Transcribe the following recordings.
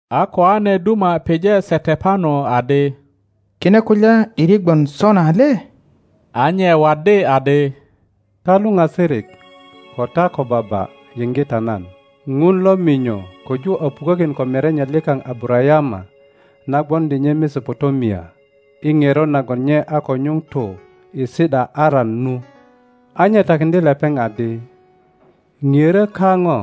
A koane duma pije Setepano adi, Kine kulya ’diri gwon sona le? A nye waddi adi, Ta luŋasirik ko ta kobaba, yiŋge ta nan. Ŋun lo minyo köju a pukökin ko merenye likaŋ Abarayama na gwoŋdi nye Mesopotamia, i ŋerot nagon nye a ko nyuŋ tu i si ’da Aran nu. A nye takiŋdye lepeŋ adi, Ŋiörö kaŋo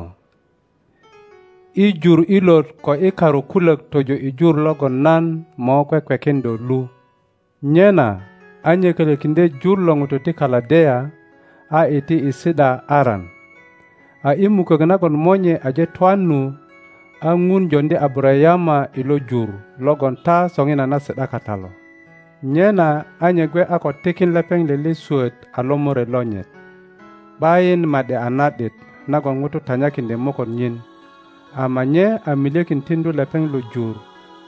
i jur ilot ko i karu kulök tojo i jur logon nan mo kwekwekin do lu. Nyena a nye kölökiŋdye jur lo ŋutu ti Kaledea a iti i si ’da Aran. A i mukök nagon monye aje twan nu, a Ŋun joŋdi Abarayama i lo jur logon ta soŋinana si ’da kata lo; nyena a nye gwe a ko tikin lepeŋ lele swöt a lomore lonyit, ’bayin ma ’di a na ’dit nagon ŋuto tanyakiŋdye moköt nyin, ama nye a milyekin tiŋdu lepeŋ lo jur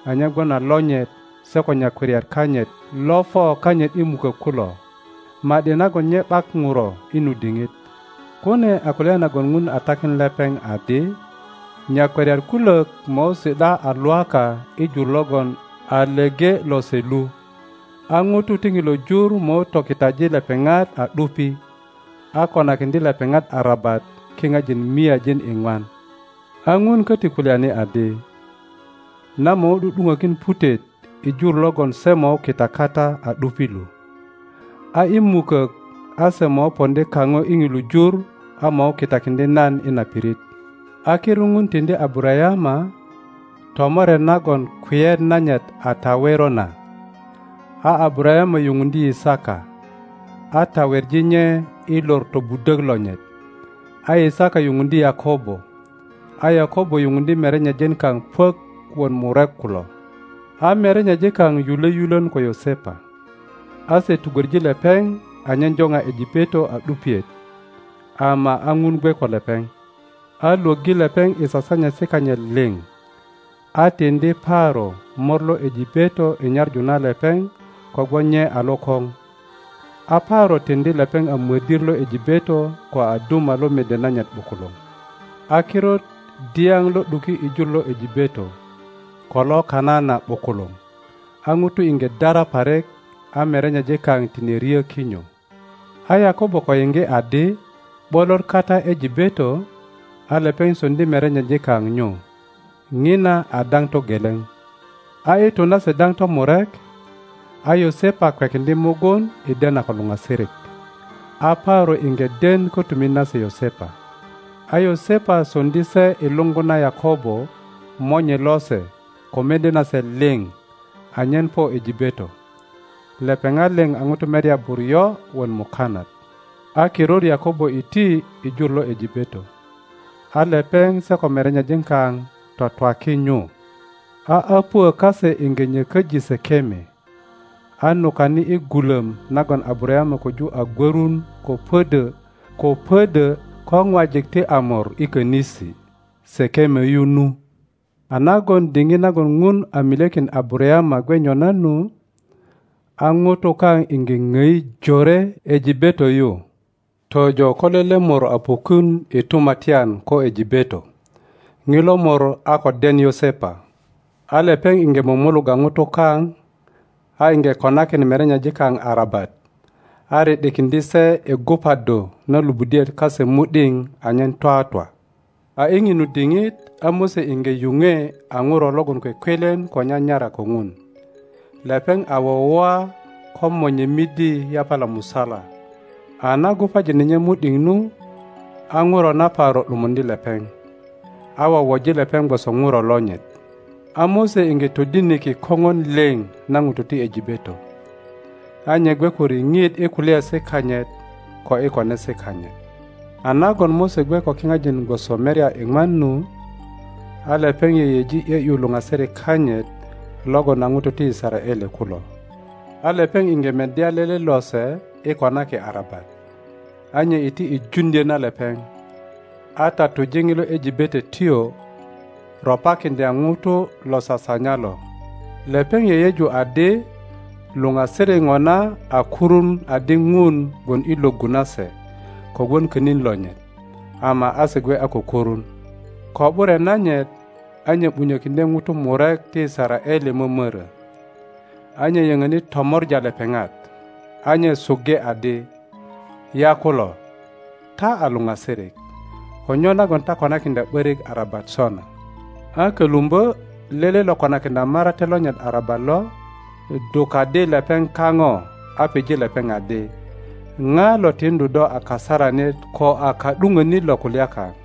anyen gwon a lonyit se ko nyakwariat kanyit lo po kanyit i mukök kulo, ma ’di nagon nye ’bak ŋuro i nu diŋit. Kune a kulya nagon Ŋun a takin lepeŋ adi, Nyakwariat kulök mo si ’da a Lwaka i jur logon a leŋe lose lu, a ŋutu ti ŋilo jur mo tokitaji lepeŋat a ’dupi, a konakiŋdye lepeŋat arabat kipajin miajin iŋwan. A Ŋun köti kulyani adi, Nan mo ’du ’dupökin putet i jur logon se mo kita kata a ’dupi lu, a i mukök a se mo poŋdi kaŋo i ŋilu jur a mo kitakiŋdye nan i na pirit. —35.18A kirut Ŋun tiŋdi Abarayama tomoret nagon kweyet nanyit a tawero na, a Abarayama yupundye Yisaka, a taweŋi nye i lor tobudök lonyit; a Yisaka yupundye Yakobo, a Yakobo yupundye merenyejin kaŋ puök wot murek kulo. A merenyejin kaŋ yule yulön ko Yosepa, a se tugwöŋi lepeŋ anyen jopa Ejipeto a ’dupiet; ama a Ŋun gwe ko lepeŋ, a lwöggi lepeŋ i sasanyesi kanyit liŋ, a tiŋdi Paro mor lo Ejipeto i nyaŋu na lepeŋ kogwon nye a lokoŋ. A Paro tiŋdi lepeŋ a mödir lo Ejipeto ko a duma lo mede nanyit ’bukuluŋ. A kirut dyap lo ’duki i jur lo Ejipeto ko lo Kanana ’bukuluŋ, a ŋutu iŋge dara parik, a merenyejin kaŋ tine ryo kinyo. A Yakobo ko yiŋge adi ’bolot kata Ejipeto, a lepeŋ soŋdi merenyejin kaŋ nyu. Ŋina a daŋ togeleŋ. A i tu nase daŋ tomurek, a Yosepa kwekiŋdye mugun i dena ko luŋasirik, a Paro iŋge den kotumit nase Yosepa. A Yosepa soŋdi se i luŋgu na Yakobo monye lose ko mede nase liŋ anyen po Ejipeto. Lepeŋat liŋ a ŋutu merya buryo wot mukanat. A kirut Yakobo iti i jur lo Ejipeto; a lepeŋ se ko merenyejin kaŋ twatwaki nyu, a öpuö kase iŋge nyököji Sekeme, a nukani i gulom nagon Abarayama koju a gwörun ko pödö ko ŋwajik ti Amor i konisi Sekeme yu nu. A nagon diŋit nagon Ŋun a milyekin Abatayama gwe nyona nu, a ŋutu kaŋ iŋge ŋoi jore Ejipeto yu, tojo ko lele mor a pukun i tumatyan ko Ejipeto ŋilo mor a ko den Yosepa. A lepeŋ iŋge mumulugga ŋutu kaŋ a iŋge konakin merenyejin kaŋ arabat, a ri ’dikiŋdye se i gubaddu na luŋudiet kase mu ’diŋ anyen twatwa. A i ŋinu diŋit a Mose iŋge yuŋwe a ŋuro logon kwekwelen ko nyanyara ko ŋun. Lepeŋ a wowoa ko monye midi yapala musala, a na gubajine nye mu ’diŋ nu, a ŋuro na Paro ’dumuŋdye lepeŋ, a wowoji lepeŋ gwoso ŋuro lonyit. A Mose iŋge todiniki koŋon liŋ na ŋutu ti Ejipeto, a nye gwe ko riŋit i kulyaesi kanyit ko i konesi kanyit. A nagon Mose gwe ko kiŋajin gwoso merya iŋwan nu, a lepeŋ yeyeji ’yö ’yu luŋasirik kanyit logon a ŋutu ti Yisaraele kulo. a lepeŋ iŋge meddya lele lose i konaki arabat, a nye iti i juŋdyo na lepeŋ, a tatuje ŋilo Ejipetotyo ropakiŋdya ŋuto lo sasanya lo. Lepeŋ yeyeju adi luŋasirik ŋona a kurun adi Ŋun gwon i lwöggu na se kogwon könin lonyit, ama a se gwe a ko kurun. Ko ’bure nanyit a nye ’bunyö kiŋdye ŋutu murek ti Yisaraele momorö, a nye yöŋöni tomor a lepeŋat, a nye suŋge adi, Yakulo, ta a luŋasirik, ko nyo nagon ta konakiŋdya ’börik arabat sona? a kölumbö lele lo konakiŋdya marate lonyit arabat lo, dukaddi lepeŋ kaŋo a pije lepeŋ adi, ŋa lo tiŋdu do a kasaranit ko a ka ’duponit lo kulya kaŋ?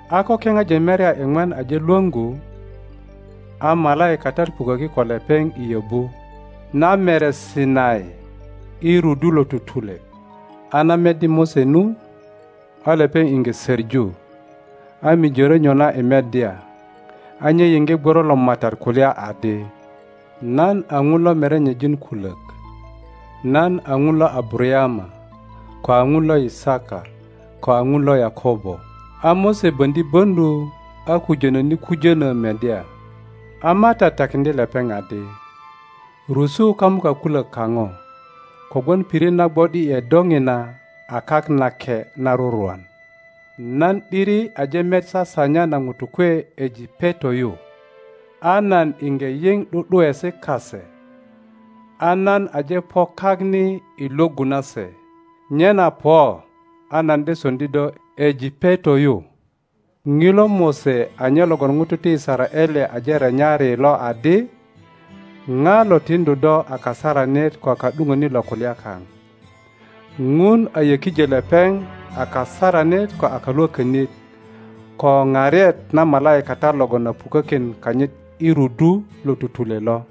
A ko kipajin merya iŋwan aje lwöŋgu, a malaikatat puköki ko lepeŋ i yöbu na mere Sinai, i rudu lo tutule. A na meddi Mose nu, a lepeŋ iŋge soŋu, a mijörö nyona i meddya, a nye yiŋge gworo lo Matat kulya adi, Nan a Ŋun lo merenyejin kulök, nan a Ŋun lo Abarayama, ko a Ŋun lo Yisaka, ko a Ŋun lo Yakobo. A Mose boŋdi böŋdu, a kujönöni kujönö meddya. a Matat takiŋdye lepeŋ adi, Rusu kamuka kulök kaŋo, kogwon pirit na gwo ’di ’e do ŋina a kak nake na rurwan. Nan ’diri aje met sasanya na ŋutu kwe Ejipeto yu, a nan iŋge yiŋ ’du ’duesi kase, a nan aje po kak ni i lwöggu na se, nyena po, a nan de soŋdi do Ejipeto yu. Ŋilo Mose a nye logon ŋutu ti Yisaraele aje renyari lo adi, Ŋa lo tiŋdu do a kasaranit ko a ka ’duŋönit lo kulya kaŋ? Ŋun a yökijö lepeŋ a kasaranit ko a kalwokönit, ko paret na malaikatat logon a pukökin kanyit i rudu lo tutule lo.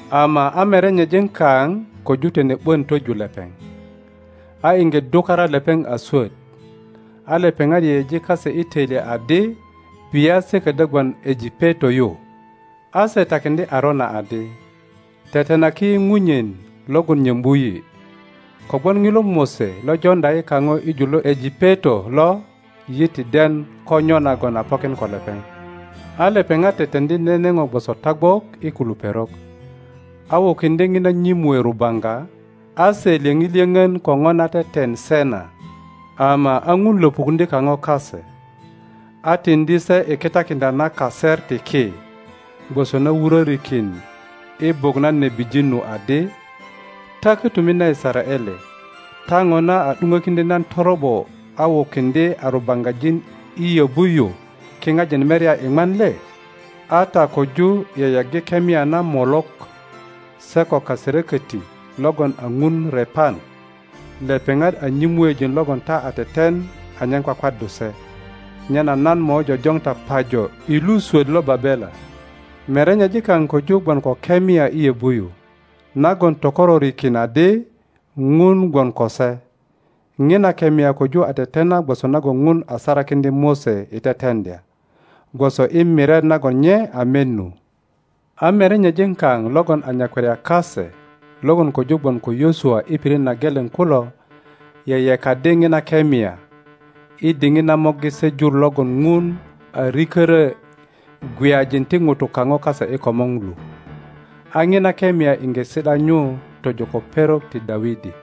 Ama a merenyejin kaŋ koju tine ’bon twoju lepeŋ, a iŋge dukara lepeŋ a swot, a lepeŋat yeyeji kase i toilyet adi bia se kodyo gwon Ejipeto yu, a se takiŋdye Arona adi, Tetenaki yi ŋunyen logon nyombu yi. Kogwon Ŋilo Mose lo Joŋdya yi kaŋo i jur lo Ejipeto lo yi ti den ko nyo nagon a pokin ko lepeŋ. A lepeŋat teteŋdi nene ŋo gwoso tagwok i kilu perok, a wukiŋdye ŋina nyomue rubaŋga, a se lyöŋi lyöŋön ko Ŋo na teten se na. Ama a Ŋun lopukuŋdye kaŋo kase, a tiŋdi se i kitakiŋdya na kaset ti ki, gwoso na wurorikin i buk na nebijin nu adi, Ta kotumit na Yisaraele, ta ŋona a ’duŋökiŋdyö nan toro ’bo a wukiŋdye a rubaŋgajin i yöbu yu kiŋajin merya iŋwan le? A ta koju yeyeggi kemia na Molok, se ko kaserokoti logon a ŋun Repan, lepeŋat a nyomuejin logon ta a tetenanyen kwakwaddu se.Nyena nan mo jojoŋ ta pajo i lu swot lo Babela. Merenyejin kaŋ koju gwon ko kemia i yobu yu nagon tokororikin adi Ŋun gwon ko se. Ŋina kemia koju a tetena gwoso nagon Ŋun a sarakiŋdya Mose i teteŋdya, gwoso i miret nagon nye a met nu. a merenyejin kaŋ logon a nyakwariat kase logon koju gwon ko Yosua i pirit na geleŋ kulo yeyekaddi ŋina kemia, i diŋit na morgi se jur logon Ŋun a riköro gweyajin ti ŋutu kaŋo kase i komor lu. A ŋina kemia iŋge si ’da nyu tojo ko perok ti Dawidi.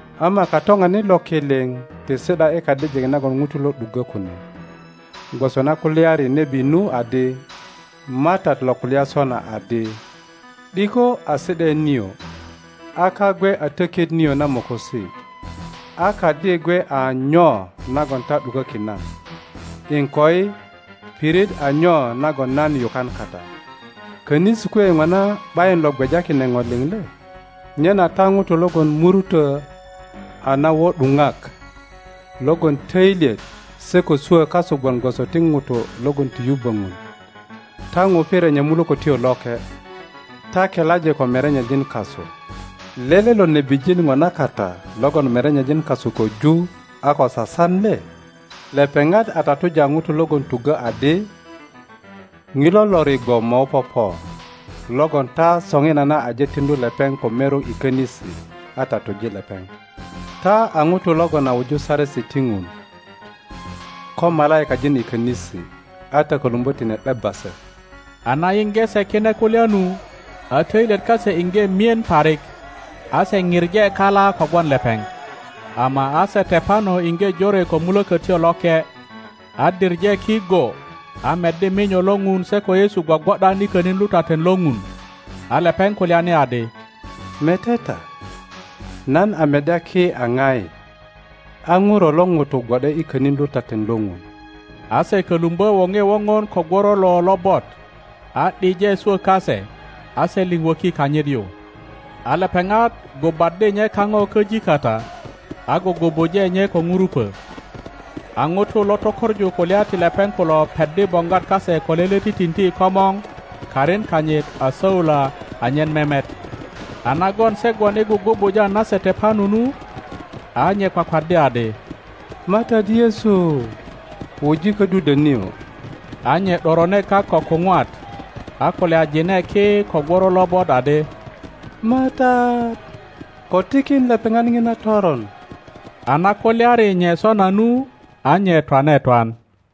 Ama Katoŋanit lo ki liŋ ti si ’da i kadijik nagon ŋutu lo ’duggo kune, gwoso na kulyari nebi nu adi, Matat lo kulya sona adi, ’Diko a si ’daet nio, a kak gwe a tokit nio na mokosi, a kadi gwe a nyo nagon ta ’dukökin nan? iŋkoi, pirit a nyo nagon nan yukan kata? Konisi kwe ŋona ’bayin lo gweja kine ŋo liŋ le? Nyena ta ŋutu logon ko muruto a nawo ’duŋak, logon toilyet se ko swo kasu gwon gwoso ti ŋutu logon ti yubbö ŋun, ta ŋupi renya Mulökötyo Loke. Ta kelaji ko merenyejin kasu. Lele lo nebijin ŋona kata logon merenyejin kasu koju a ko sasan le? Lepeŋat a tatuja ŋutu logon tuggo adi ŋilo Lorigwo mo popo, logon ta soŋinana aje tiŋdu lepeŋ ko merok i konisi, a tatuje lepeŋ. Ta a utu logon a wiriju Saresi ti Ŋun ko malaikajin i konisi, a ta kolumbo tine ’debba se. A na yiŋge se kine kulya nu, a toilyet kase iŋge mien parik, a se pije kala kogwon lepeŋ. Ama a Setepano iŋge jore ko Mulokotyo Loke, a diŋe ki go, a meddi minyo lo Ŋun se ko Yesu gwogwo ’dan i konin lutaten lo Ŋun. A lepeŋ kulyani adi, Mete ta, nan a meddya ki a ŋai, a Ŋuro lo ŋuto gwo ’de i konin lutaten lo Ŋun. A se kolumbo worie wogon ko gworolo lobot, a ’dije swo kase, a se liŋ woki kanyit yu, a lepeŋat gubaddi nye kaŋo köji kata, a gugubuje nye ko ŋurupo. A ŋutu lo tökoŋu kulya ti lepeŋ kulo peddi boŋgwat kase ko lele titinti i komor karin kanyit a Saula anyen memet. a nagon se gwon i gugubuja na Setepano nu, a nye kwakwaddi adi, Matat Yesu, wuji kodudwo nio. A nye ’dorone kak ko kuŋwat, a kulyajine ki ko gworo lobot adi, Matat, ko tikin lepeŋat ŋina toron. A na kulyari nye sona nu, a nye twane twan.